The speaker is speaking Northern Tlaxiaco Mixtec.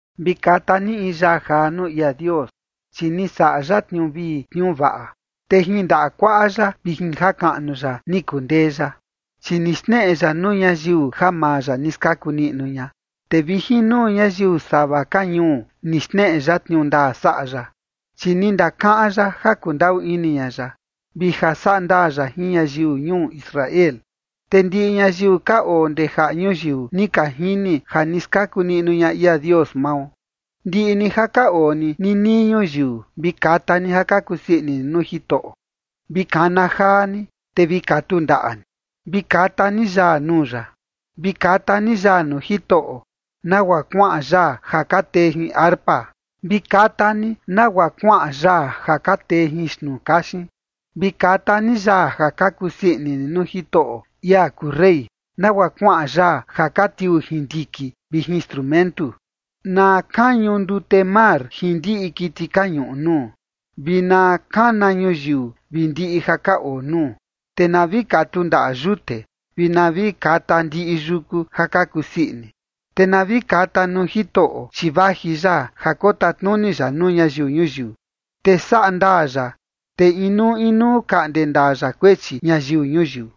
Vi kata ni in yaa jaa nuu ia Dios, chi ni saꞌa ya tniuu vii tniuu vaꞌa, te jin ndaꞌa kuaꞌa ya vi jin jakaꞌnu ya ni kundee ya. Chi ni xneꞌe ya nuu ñayiu ja maa ya ni skaku niꞌnu ña, te vi jin nuu ñayiu sava ka ñuu, ni xneꞌe ya tniuu ndaa saꞌa ya. Chi ni ndakaꞌan ya ja kundaꞌu ini ña ya, vi ja saꞌa ndaa ya jin ñayiu ñuu Israel. Te ndiꞌi ñayiu ka oo ndee jaꞌa ñuyiu ni ka jini ja ni skaku niꞌnu ña ia Dios mao. Ndiꞌi ni ja ka oo ni ninii ñuyiu, vi kata ni ja ka kusii ini ni nuu Jitoꞌo, vi kana jaa ni, te vi katu ndaꞌa ni, vi kata ni yaa nuu ya. Vi kata ni yaa nuu Jitoꞌo, nagua kuaꞌan yaa ja ka tee jin arpa. Vi kata ni nagua kuaꞌan yaa ja ka tee jin xtnuu kaxin. Vi kata ni yaa ja ka kusii ini ni nuu Jitoꞌo, ia kuu rey, nagua kuaꞌan yaa ja ka tiuu jin ndiki vi jin strumentu. Na kañu ndute mar jin ndiꞌi kiti ka ñuꞌu nuu, vi na kana ñuyiu vi ndiꞌi ja ka oo nuu. Te na vi katu ndaꞌa yute, vi na vi kata ndiꞌi yuku ja ka kusii ini, te na vi kata nuu Jitoꞌo, chi vaji ya ja kotatnuni ya nuu ñayiu ñuyiu. Te saꞌa ndaa ya, te inuu inuu kaꞌnde ndaa ya kuechi ñayiu ñuyiu.